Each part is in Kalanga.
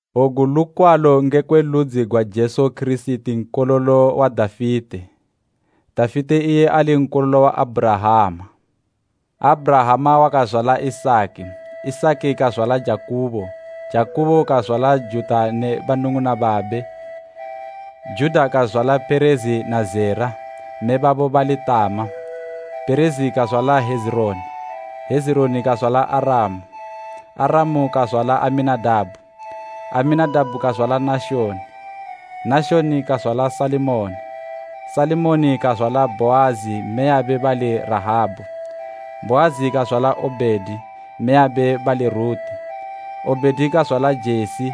Ogu lukwalo ngekwe ludzi gwa Jesu Kirisiti nkololo wa Dafite, Dafite iye ali nkololo wa Abhurahama: Abhurahama wakazwala Isaki, Isaki kazwala Jakubo, Jakubo kazwala Juda ne banung'una babe. Juda kazwala Perezi na Zera, mme babo bali Tama, Perezi kazwala Hezironi, Hezironi kazwala Aramu. Aramu kazwala Aminadabhu, Aminadabhu kazwala Nashoni, Nashoni kazwala Salimoni. Salimoni kazwala Bhoazi mmeyabe bali Rahabu, Bhoazi kazwala Obhedi mmeyabe bali Ruti; Obhedi kazwala Jesi.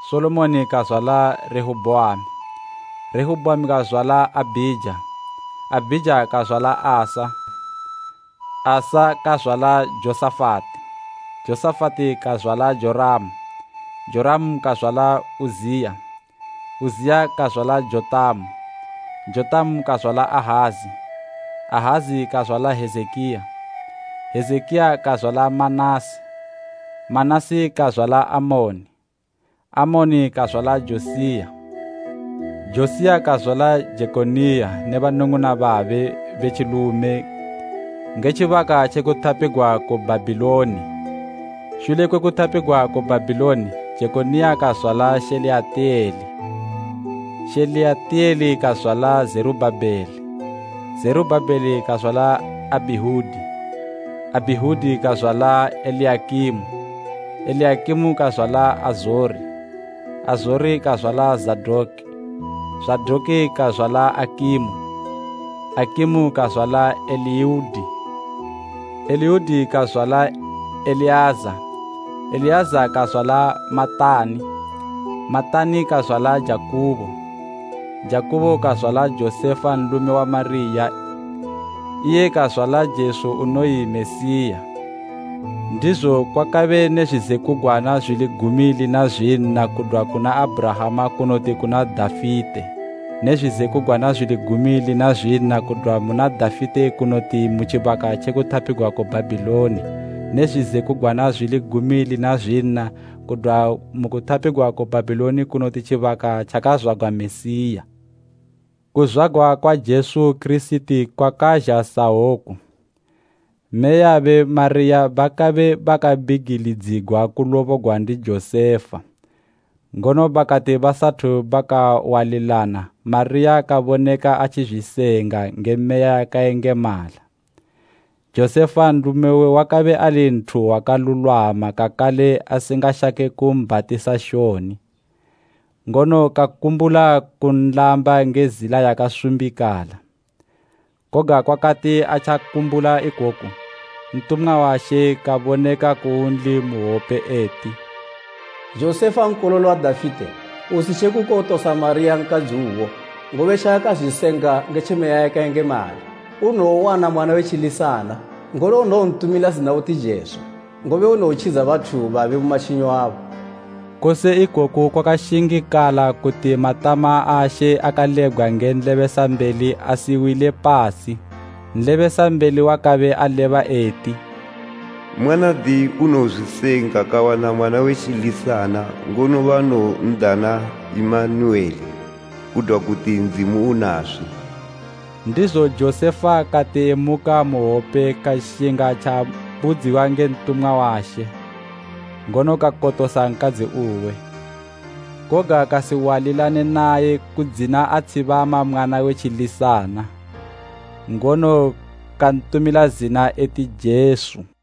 Solomoni kazwala Rehobhoamu, Rehobhoamu kazwala Abhija, Abhija kazwala Asafi. Asafi kazwala Jehoshafati, Jehoshafati kazwala Joramu, Joramu kazwala Uziya, Uziya kazwala Jotamu, Jotamu kazwala Ahazi, Ahazi kazwala Hezekiya. Hezekiya kazwala Manase, Manase kazwala Amoni, Amoni kazwala Josiya, Josiya kazwala Jekoniya ne banung'una babe be tjilume nge tjibaka tje kutapigwa ku Bhabhiloni. Shule kwe kutapigwa ku Bhabhiloni, Jekoniya kazwala Sheyalitiyele, Sheyalitiyele kazwala Zerubhabeli. Zerubhabeli kazwala Abhiudi, Abhiudi kazwala Eliyakimu, Eliyakimu kazwala Azori. Azori kazwala Zadoki, Zadoki kazwala Akimu, Akimu kazwala Eliudi. Eliudi kazwala Eleaza, Eleaza kazwala Matani, Matani kazwala Jakubo. Jakubo kazwala Josefa nlume wa Mariya iye kazwala Jesu unoyi Mesiya. Ndizo kwakabe ne zwizekugwana zwili gumi lina zwinna kudwa kuna Abhurahama kunoti kuna Dafite ne zwizekugwana zwili gumi lina zwinna kudwa muna Dafite kunoti mu tjibaka tjekutapigwa ku Bhabhiloni ne zwizekugwana zwili gumi lina zwinna kudwa mu kutapigwa ku Bhabhiloni kunoti tjibaka tjakazwagwa Mesiya. Kuzwagwa kwa Jesu Kirisiti kwakazha sahwoku: Mmeyabe Mariya bakabe bakabigilidzigwa kulobogwa ndi Josefa, ngono bakati basathu bakawalilana Mariya kaboneka atjizwisenga nge Meya yakayengemala. Josefa nlume uwe wakabe ali nthu wakalulwama kakale asingashake kumbhatisa shoni, ngono kakumbula kunlamba nge zila yakasumbikala. Koga kwakati atjakumbula ikoku, ntumwa wa She kaboneka kunli mu hwope eti, “Josefa nkololo wa Dafite, usitje kukotosa Mariya nkadzi uwo, ngobe tjaakazwisenga nge tje Meya yakayengemala. Unowowana mwana we tjilisana, ngono unowontumila zina uti Jesu, ngobe unowotjidza bathu babe mu matjinyo abo.” Kose ikoku kwakashingikala kuti matama a She akalebgwa nge nlebesambeli asiwile pasi. Nlebesambeli wakabe aleba eti, Mwanadi unowozwisenga kawana mwana we tjilisana ngono banowondana Imanuwele.” Kudwa kuti, “Ndzimu Unaswi.” Ndizo Josefa kati emuka mu hwope kashinga tjaabudziwa nge ntumwa wa She ngono kakotosa nkadzi uwe. Koga kasiwalilane naye kudzina atshibama mwana we tjilisana, ngono kantumila zina eti Jesu.